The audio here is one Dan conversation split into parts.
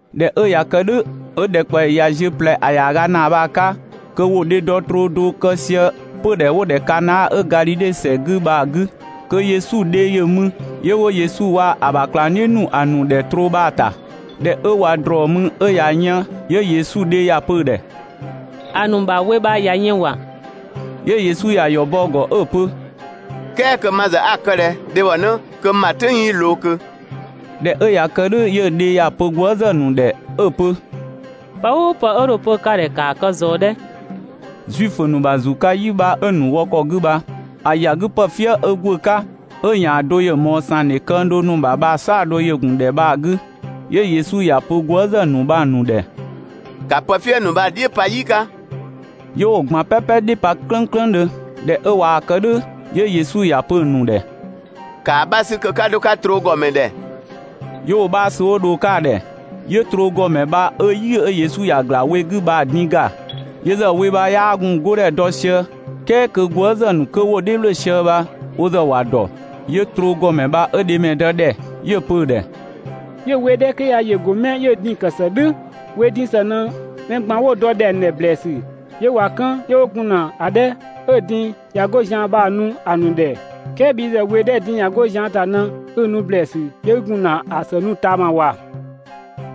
꞊Dhɛ 'ö ꞊ya kë "dhʋ̈, 'ö ‑dhɛkpaɔyi ꞊ya ziö ꞊plɛ ‑a ‑yaaga ‑naa bha‑ 'ka kö ‑wo dhedɔ troo do kë sië 'pödhɛ 'wo‑ ‑dhɛ Kana 'ö Gadhidhe ‑sɛ 'gü bha‑ 'gü, kö Yesu dhe ‑yö mü, 'yö 'wo Yesu waa‑ ö bha ꞊klangdhiʋ̈ ‑nu ‑a ‑nu ‑dhɛ troo bha‑ ‑ta. ꞊Dhɛ 'ö ꞊wa ‑drɔɔ mü 'ö‑ ꞊ya yën. 'Yö Yesu dhe ‑ya pö‑ ‑dhɛ: «‑A ‑nu ‑bha we bha ꞊ya yën ‑wa!» 'Yö Yesu ꞊ya ‑yɔ bɔ‑ ‑gɔ 'ö‑ pö: «"Kɛɛ kö ma ‑zë 'a‑ kë ꞊dhɛ, dhebhɔnë, kö n ‑bha "tʋ̈ng 'yii ꞊loo ꞊kö?» ꞊Dhɛ 'ö ꞊ya kë "dhʋ̈ 'yö‑ dhe ‑ya pö gwëëzë ‑nu ‑dhɛ 'ö‑ pö: «Pë "ʋʋ pë 'ö dho‑ pö ka ‑dhɛ ‑kaa kë ꞊zɔɔ 'dhɛ!» Zuifö ‑nu ‑bha ‑zu 'ka "yi 'bha 'ö‑ ‑nu wɔ ‑kɔ 'gü bha‑ ‑ya 'gü pë "fië 'ö ‑gwë 'ka, 'ö‑ ‑yan do ‑yö ꞊mɔɔ ‑sangdhe këng do ‑nu ‑bha bha‑ "saɔdo ‑yö ‑gun ‑dhɛ bha‑ 'gü. 'Yö Yesu ‑ya pö gwëëzë ‑nu bha‑ ‑nu ‑dhɛ: «‑Ka pë "fië ‑nu bha‑ "dhiʋ̈ pa "yi 'ka!» 'Yö 'wo‑ ꞊gban "pɛpɛ "dhiʋ̈ pa "klënklëndhö. ꞊Dhɛ 'ö ꞊waa‑ kë "dhʋ̈, 'yö Yesu ‑ya pö‑ ‑nu ‑dhɛ: «‑Kaa 'bha 'sü kö 'ka 'dho‑ 'ka troo ‑gɔmɛ ‑dhɛ!» 'Yö 'wo‑ 'bha sü 'wo dho‑ 'ka‑ ‑dhɛ. 'Yö troo ‑gɔmɛ bha 'ö "yi 'ö Yesu ‑ya ‑gla we 'gü bha‑ din ‑ga. Yö ‑zë we bha 'yaa gun‑ 'godhɛ dɔ sië "kɛɛ kö gwëëzë ‑nu 'kö 'wo‑ "dhiʋ̈ ‑wlö sië bha wo ‑zë ‑wa ‑dɔ. 'Yö troo ‑gɔmɛ bha 'ö dhemɛdë ‑dhɛ, 'yö‑ pö‑ ‑dhɛ: «('Yö‑ we 'dhɛ 'kö ya ‑yö ‑go 'mɛ 'yö‑ din‑ ‑kë ‑së "dhʋ̈) we din ‑së ꞊në mɛ ꞊gban 'wo‑ ‑dɔ ‑dhɛng ‑dhɛ ‑blɛɛsü 'yö ꞊wa 'kën 'yö 'wo gun ‑na ‑a 'dhɛ 'ö‑ din ꞊ya 'go zian ‑ta bha‑ nu ‑a ‑nu ‑dhɛ, "kɛɛ bhi ‑zë we 'dhɛ‑ din ꞊ya 'go zian ‑ta ꞊në 'i‑ nu ‑blɛɛsü 'yö 'i gun ‑na ‑a ‑së nu ꞊taama ‑wa!»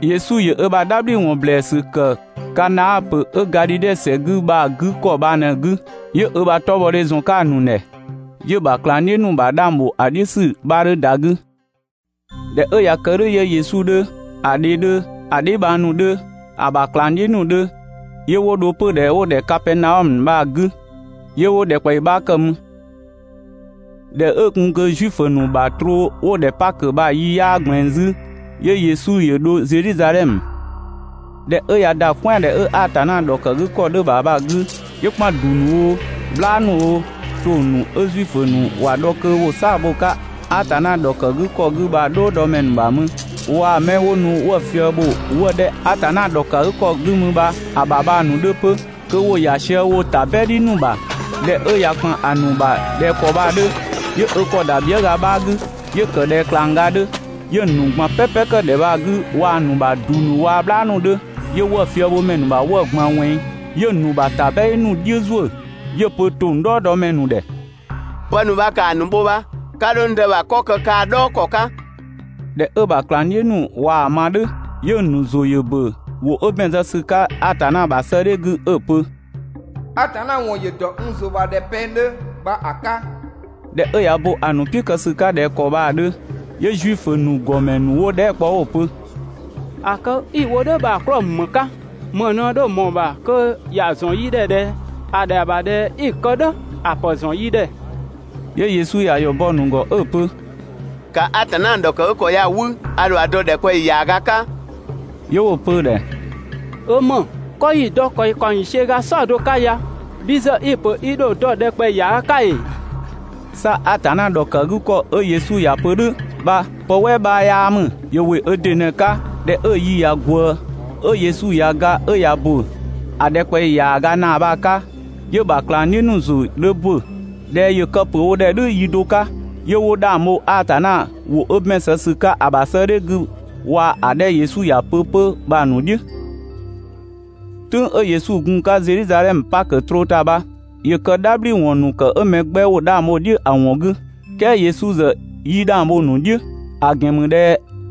Yesu ‑yö ö ‑bha "dhabhliwɔn ‑blɛɛsü ‑kë Kana ‑pö 'ö Gadhidhe ‑sɛ 'gü bha‑ 'gü ‑kɔ bha ꞊në‑ 'gü, 'yö ö ‑bha 'tɔbhɔdhe ‑zɔn 'ka‑ ‑nu ‑dhɛ. 'Yö‑ ‑bha ꞊klangdhiʋ̈ ‑nu ‑bha 'dhang ‑bho ‑a "dhiʋ̈ ‑sü 'bha 'dhö ‑da 'gü. ꞊Dhɛ 'ö ꞊ya kë "dhʋ̈ 'yö Yesu 'dhö, ‑a dhe 'dhö, ‑a dheebhang ‑nu 'dhö, ‑a ‑bha ꞊klangdhiʋ̈ ‑nu 'dhö, 'yö 'wo dho 'pödhɛ 'wo‑ ‑dhɛ Kapɛɛnaɔmö bha‑ 'gü 'yö 'wo ‑dhɛkpaɔyi 'bha ‑kë mü. ꞊Dhɛ 'ö gun kö Zuifö ‑nu ‑bha troo 'wo‑ ‑dhɛ Pakö bha‑ yi 'yaa ꞊gblɛɛn 'zü, 'yö Yesu ‑yö dho Zedhizadhɛmö. ꞊Dhɛ 'ö ꞊ya ‑da "kwɛandhɛ 'ö Atanna ‑dhɔkëgükɔ 'dhö‑ ‑bha bha‑ 'gü, 'yö ‑kpan ‑du ‑nu oo, "bhlaa ‑nu oo, ‑tong ‑nu ('ö Zuifö ‑nu ‑wa dhɔ kö ‑wo "saa‑ bho‑ 'ka Atanna ‑dhɔkë 'gü ‑kɔ 'gü bha‑) "dhɔɔdɔmɛ ‑nu ‑bha mü, waa‑ 'mɛ 'wo nu 'wëë‑ fië bho 'wëë‑ 'dhɛ 'ö Atanna ‑dhɔkëgükɔ 'gü mü ‑bha ‑bha bha‑ ‑nu 'dhö 'pö kö ‑wo ‑ya sië woo‑ ‑tabɛdhi ‑nu ‑bha. ꞊Dhɛ 'ö ꞊ya ‑kpan ‑nu ‑bha ꞊dhɛ ‑kɔ bha‑ 'dhö, 'yö ö ‑kɔ ‑da bhiëga 'bha 'gü 'yö‑ ‑kë ꞊dhɛ ꞊klangga 'dhö, 'yö‑ ‑nu ꞊gban "pɛpɛ ‑kë ‑dhɛ bha‑ 'gü waa‑ ‑nu ‑bha ‑du ‑nu waa‑ "bhlaa ‑nu 'dhö, 'yö 'wëë‑ fiëbhomɛ ‑nu ‑bha 'wëë‑ ꞊gban ꞊wɛnng, 'yö‑ ‑nu ‑bha ‑tabɛdhi ‑nu "dhiʋ̈ ‑zuö, 'yö‑ pö ‑tong "dhɔɔdɔmɛ ‑nu ‑dhɛ: «Pë ‑nu bha ‑kaa ‑nu bho bha, 'ka 'dho n Dë ‑bha 'kɔ kë kaa‑ "dhɔɔ ‑kɔ 'ka!» ꞊Dhɛ 'ö‑ ‑bha ꞊klangdhiʋ̈ ‑nu ꞊waa‑ ma "dhʋ̈, 'yö‑ ‑nu ‑zʋ ‑yö ‑bö ‑wʋ 'ö ‑bɛn zë ‑sü 'ka Atanna ‑bha 'sëëdhɛ 'gü 'ö‑ pö: ‹Atanna ‑wɔn ‑yö ‑dɔ n ‑zʋ ‑bha ꞊dhɛ pɛng 'dhö› bha‑ 'ka.» ꞊Dhɛ 'ö ꞊ya bo ‑a ‑nu "piʋ̈ kë ‑sü 'ka ꞊dhɛ ‑kɔ bha‑ 'dhö, 'yö Zuifö ‑nu ‑gɔmɛ ‑nu 'wo‑ dhɛɛ" kpɔ 'wo‑ pö: «‑A kë 'i‑ wo "dhʋ̈ bha‑ 'klɔɔ‑ ‑mü ‑më 'ka? ‑Më ꞊në dho ꞊mɔɔ‑ ‑bha kö ‑ya ‑zɔn yi ‑dhɛ ꞊dhɛ ‑a ‑dhɛa ‑bha ꞊dhɛ 'i‑ kë "dhʋ̈, ‑a ‑pë ‑zɔn yi ‑dhɛ!» 'Yö Yesu ‑ya ‑yɔ bɔ‑ ‑nu ‑gɔ 'ö‑ pö: «‑Ka Atanna ‑dhɔkëgükɔ ya‑ 'wü, a ‑dho dɔ ‑dhɛkpaɔyi ‑yaaga 'ka.» 'Yö 'wo‑ pö‑ ‑dhɛ: «'Ö ‑më! 'Kɔ 'yi‑ dɔ ‑kwɛ ‑kaɔng ‑yiisiö ga "saɔdo 'ka ya bhi ‑zë i‑ ‑pö i ‑dho dɔ ‑dhɛkpaɔyi ‑yaaga 'ka ‑ee?» 'Sa Atanna ‑dhɔkëgükɔ 'ö Yesu ‑ya pö "dhʋ̈ bha pë "wɛɛ 'bha 'yaa ‑mü, ‑yö ‑wɩ ö ‑dɩ ꞊në‑ 'ka. ꞊Dhɛ 'ö‑ yi ꞊ya ꞊gwëë 'ö Yesu ꞊ya ga 'ö ꞊ya ‑bö (‑a ‑dhɛkpaɔyi ‑yaaga ‑naa bha‑ 'ka), 'yö‑ ‑bha ꞊klangdhiʋ̈ ‑nu ‑zʋ 'dhö ‑bö ꞊dhɛ ‑yö kë‑ pö wo ‑dhɛ "dhʋ̈ yi do 'ka, 'yö 'wo 'dhang bho Atanna ‑wʋ 'ö ‑bɛn zë ‑sü 'ka 'sëëdhɛ 'gü waa‑ 'dhɛ 'ö Yesu ‑ya pö 'pö bha‑ ‑nu "dhiʋ̈. "Tʋ̈ng 'ö Yesu gun‑ 'ka Zedhizadhɛmö Pakö troo ‑ta bha, ‑yö kë "dhabhliwɔn ‑nu ‑kë 'ö mɛ 'gbɛ 'wo 'dhang bho‑ "dhiʋ̈ ‑a ‑wɔn 'gü, "kɛɛ Yesu ‑zë 'yii 'dhang bho‑ ‑nu "dhiʋ̈, ‑a ‑gɛn ‑mü ꞊dhɛ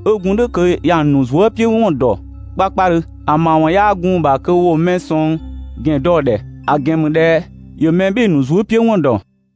'ö gun "dhʋ̈ kö ‑ya nu zuëpiʋ̈wɔn ‑dɔ 'kpakpadhö. ‑A ‑mawɔn 'yaa gun‑ ‑bha kö ‑wo mɛ sɔng ‑gɛn dɔ‑ ‑dhɛ, ‑a ‑gɛn ‑mü ꞊dhɛ ‑yö mɛ "bhɩɩ‑ ‑nu zuëpiʋ̈wɔn ‑dɔ.